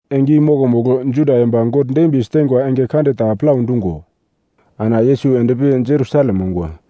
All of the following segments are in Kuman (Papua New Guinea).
Enge i mokomugl, Juda yomba God dembiye siteingwa enge kande ta plau dungo ana Yesus endpi Jerusalem ongwa.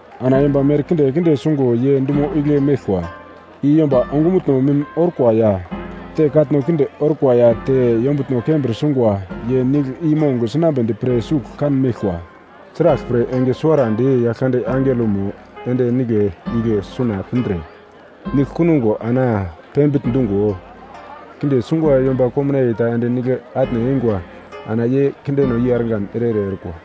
Ana yomba merkinde kinde sungo ye dumo igle meglkwa, i yomba ongumutno mim orkwa, ya te katno kinde orkwa ya te yombutno kembir sungwa ye nigl i mong sinambedi pre sugl kanmeglkwa. Sraglpre, enge suwara di Yaglkande angelomo ende nigle igle suna pindre nigl kunugo ana pembigl dungo, kinde sungwa yomba komnaiye ta ende nigle atne eingwa, ana ye kindeno i argan ere-ere orkwa.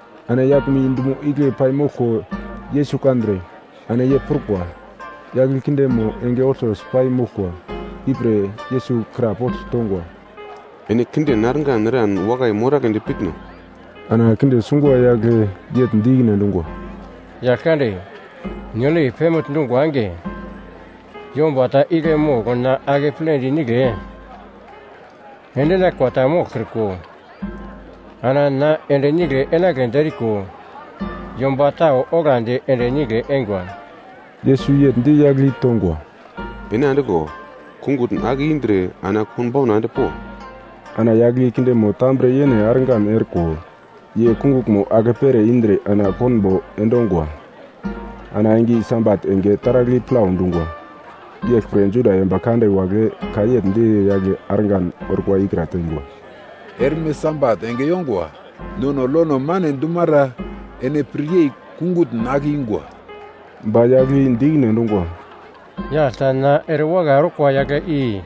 Ana yaglmo i dumo igle paimoglko Yesus kandre, ana ye prukwa, yagl i kindemo enge olto si pai moglkwa, ipre Yesus krapogl tongwa, “Ene kinden argan eran wakai moragledi pitno?” Ana kinde sungwa yagle yegl di ikine endungwa, “Yaglkande, nigl i pembigl dungwa enge, yomba ta igle mogl na akepledi nigle endinaglkwa ta moglkriko, ana na ende nigle enagledi eriko yomba tau onglandi ende nigle eingwa.” Yesus yegl di yagl i tongwa, “Ene andiglo! Kungutn ake indre ana konbauna endpo.” Ana yagl i kindemo tambre yene argan orko, ye kunguglmo akepere indre ana konbo endongwa. Ana enge i Sabat enge taragl i plau dungwa. Yeglpre Juda yomba kande wagle ka yegl di yagle argan orkwa ikra teingwa, “Erme Sabat enge yongwa, nono lono mane dumara ene piryei kungutn ake yunga.” Ba yagl i di ikine endungwa, “Yagl ta na erewakai orkwa yagle i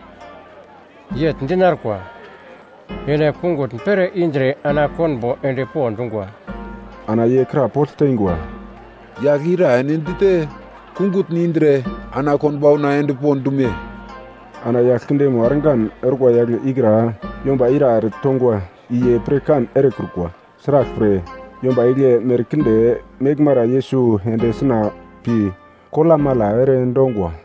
yegl dinarkwa, ‘Ene kungutn pere indre ana konbo endpo dungwa.’” Ana ye krapogl teingwa, “Yagl ira ene dite, kungutn indre ana konbauna endpo dume?” Ana yagl kindemo argan orkwa yagle ikra yomba ira ere tongwa, i ye ta pirkan erekrukwa. Sraglpre, yomba igle merkinde meglmara Yesus ende suna pi kolamala ere endongwa.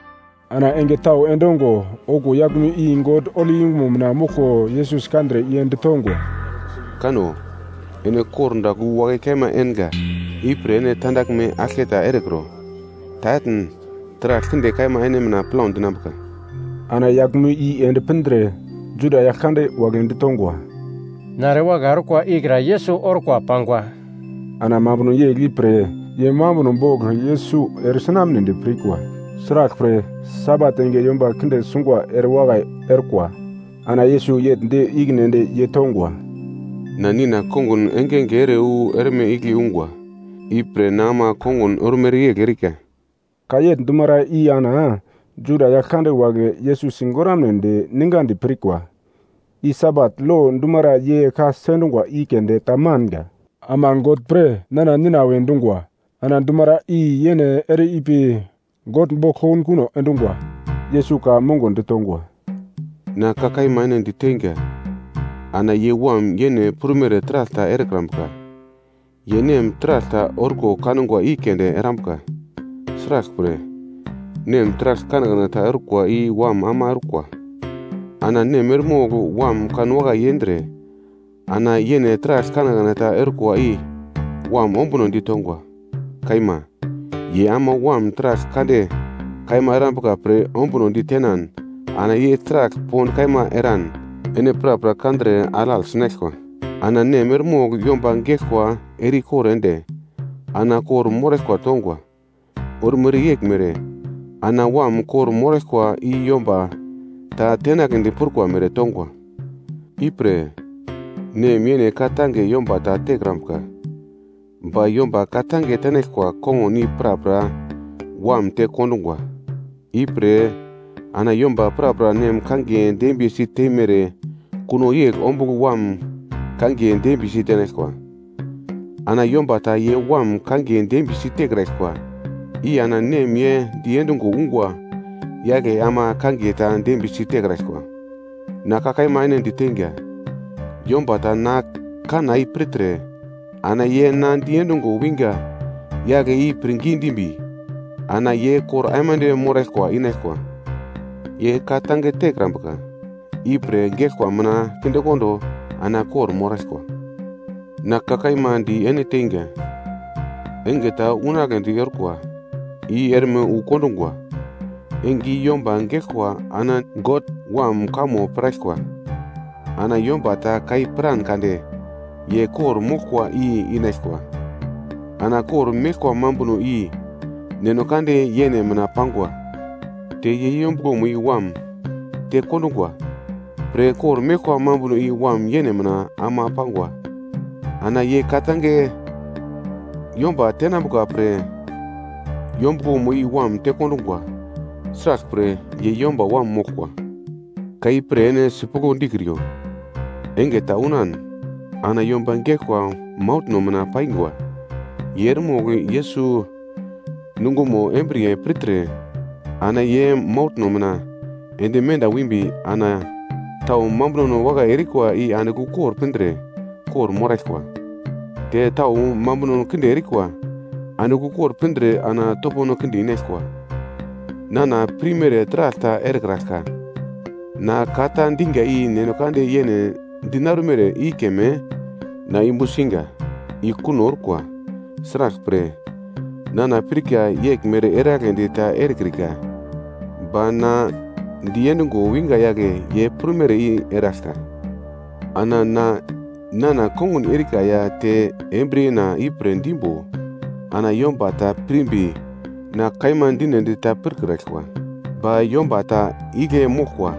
Ana enge tau endongo okuwo yaglmo i God holi yungumo mina moglko Yesus kandre ye ditongwa, “Kano, ene kordagl wu wakai kaima enga, ipre ene tandaglme aglketa erekro, ta etn, taragl kinde kaima ene mina plau dinambuka.” Ana yaglmo i ende pindre, Juda yagl kande wagle ditongwa, “Na erewakai orkwa ikra Yesus orkwa pangwa.” Ana mambuno yegl ipre ye mambuno bogl Yesus eresi tenamnedi pirkwa. Sraglpre, Sabat enge yomba kinde sungwa erewakai orkwa. Ana Yesus yegl di ikine ende ye tongwa, “Na Nina kongun engenge ere wu erme igle ungwa, ipre na ama kongun ormere yegl erika.” Ka yegl dumara i ana Juda yagl kande wagle Yesus sigoramnedi ningadi pirkwa, i Sabat lo dumara ye ka sendungwa i keunde ta manga, ama God pre nana Nina we dungwa. Ana dumara i yene ere ipi God bogl kokunkuno endungwa. Yesus ka mongo ditongwa, “Na ka kaima ene diteinga, ana ye Wam yene prumere taragl ta erekrambuka. Ye Nem taragl ta orko kangwa i keunde erambuka. Sraglpre, Nem taragl kanekane ta orkwa i Wam ama orkwa. Ana Nem eremogl Wam kanwakai yendre, ana yene taragl kanekane ta orkwa i Wam ombuno ditongwa. Kaima, ye ama Wam taragl kande kaima erambuka pre ombunodi tenan ana ye taragl pond kaima eran ene prapra kandre alagl sinaglkwa. Ana Nem eremogl yomba geglkwa ere-ikor ende, ana kor-moraglkwa tongwa, ormere yeglmere, ana Wam kor-moraglkwa i yomba ta tenagledi prukwa mere tongwa. Ipre, Nem yene ka-tange yomba ta tekrambuka. Ba yomba ka-tange tenaglkwa kongun i prapra Wam te kondungwa. Ipre ana yomba prapra Nem kangiye dembiyesi teimere kuno yegl ombugl Wam kangiye dembiyesi tenaglkwa. Ana yomba ta ye Wam kangiye dembiyesi tekraglkwa i ana Nem ye diendungo ungwa yagle ama kangiye ta dembiyesi tekraglkwa. “Na ka kaima ene diteinga, yomba ta na kanna i pirtre ana ye na diendungo wingwa yagle i pirngi dimbi, ana ye kor aimande moraglkwa inaglkwa. Ye ka-tange tekrambuka i pre geglkwa mina kindekondo ana kor-moraglkwa. Na ka kaima di ene teinga, enge ta unagledi orkwa, i erme wu kondungwa, enge i yomba geglkwa ana God Wam kamo piraglkwa. Ana yomba ta ka i piran kande ye kor-moraglkwa i inaglkwa. Ana kor-meglkwa mambuno i Neno kande yene mina pangwa, te ye yombuglomo i Wam tekondungwa pre kor-meglkwa mambuno i Wam yene mina ama pangwa. Ana ye ka-tange yomba tenambuka pre yombuglomo i Wam tekondungwa. Sraglpre, ye Yomba Wam moglkwa. “Ka ipre ene sipuglo dikriyo, enge ta unan ana yomba geglkwa mauglno mina paingwa ye eremogl Yesus nungomo embriye pirtre, ana ye mauglno mina ende menda wimbi ana tau mambuno wakai erikwa i andigl ukor pindre kor-moraglkwa, te tau mambuno kinde erikwa andigl ukor pindre ana topono kinde inaglkwa. “Nana pirmere taragl ta erekraglka, na ka ta dinga i God yene dinarumere i keme na yumbu singa, i kuno orkwa, sraglpre, nana pirka yeglmere eragledi ta erekrika, ba na diendungo winga yagle ye prumere i eraglka. Ana na nana kongun erika ya te embriyena ipre dimbo, ana yomba ta pirmbi na kaima dinedi ta pirkraglkwa. Ba yomba ta igle moglkwa.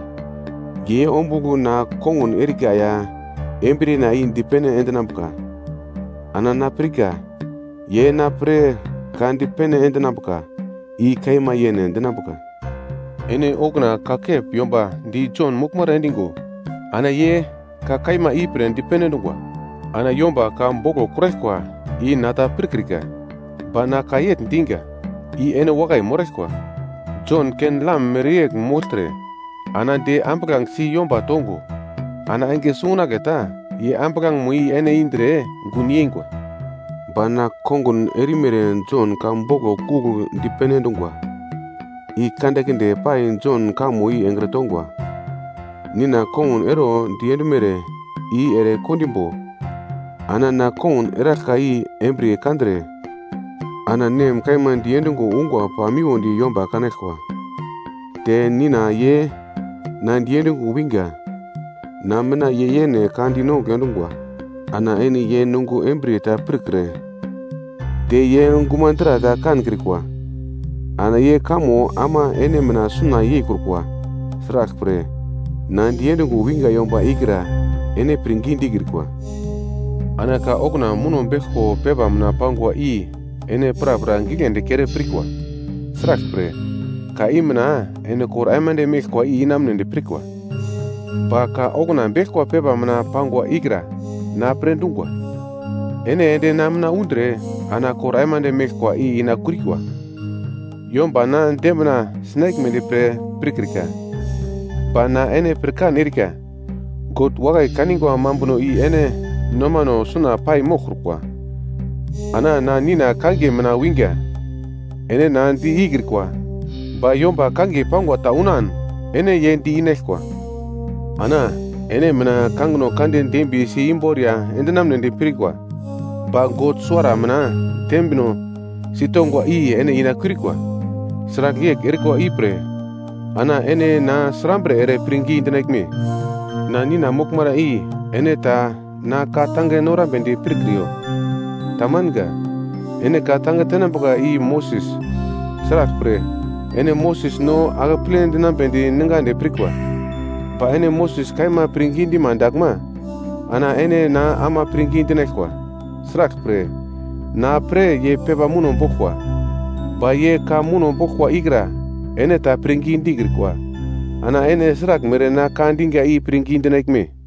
Ye ombugl na kongun erika ya embriyena i dipene endinambuka, ana na pirka ye na pre ka dipene endinambuka i kaima yene dinambuka. “Ene okuna kakep yomba di Jon moglmara endigo ana ye ka kaima ipre dipene endungwa. Ana yomba ka boglo kuraglkwa i na ta pirkrika, ba na ka yegl diga i ene wakai moraglkwa. Jon ken-lam mereyegl mogltre, ana de ambuglangesi yomba tongo, ana enge sungunagle ta ye ambuglangemo i ene indre gun yeingwa. “Ba na kongun erimere Jon ka boglo kugl dipene endungwa, i kandekinde pai Jon kamo i engre tongwa, Nina kongun ero diendumere i ere kondimbo ana na kongun eraglka i embriye kandre, ana Nem kaima diendungo ungwa pamiwodi yomba kanaglkwa, te Nina ye na diendungo winga, na mina ye yene ka dinongugl endungwa. Ana ene ye nungo embriye ta pirkre te ye gumadra ta kankrikwa. Ana ye kamo ama ene mina suna yeikrukwa; sraglpre, na diendungo winga yomba ikra ene pirngi dikrikwa. Ana ka okuna muno beglko pepa mina pangwa i ene prapra giglendi kere pirkwa. Sraglpre, ka i mina ene kor aimande meglkwa i inamunedi pirkwa. Ba ka okuna beglkwa pepa mina pangwa ikra na pre dungwa. Ene ende na mina undre ana kor aimande meglkwa ina kiurikwa. “Yomba na dembina sinaglmedi pre pirkrika. Ba na ene pirkan erika, God wakai kanigwa mambuno i ene nomano suna pai moglkrukwa. Ana na Nina kangiye mina winga, ene na di ikrikwa, ba yomba kangiye pangwa ta unan ene ye di-inaglkwa. Ana ene mina kangino kande dembiyesi imboriya endinamnedi pirkwa ba God suwara mina dembino si tongwa i ene inakiurikwa. Sragl yegl erikwa ipre ana ene na srambre ere pirngi dinaglme? “Na Nina moglmara i ene ta na ka-tange norambedi pirkriyo. Ta manga. Ene ka-tange tenambuka i Moses, sraglpre ene Moses no akeple dinambedi ningadi pirkwa. Ba ene Moses kaima pirngi dima daglma ana ene na ama pirngi dinaglkwa, sraglpre, na pre ye pepa muno boglkwa. Ba ye ka muno boglkwa ikra ene ta pirngi dikrikwa, ana ene sraglmere na ka diga i pirngi dinaglme?”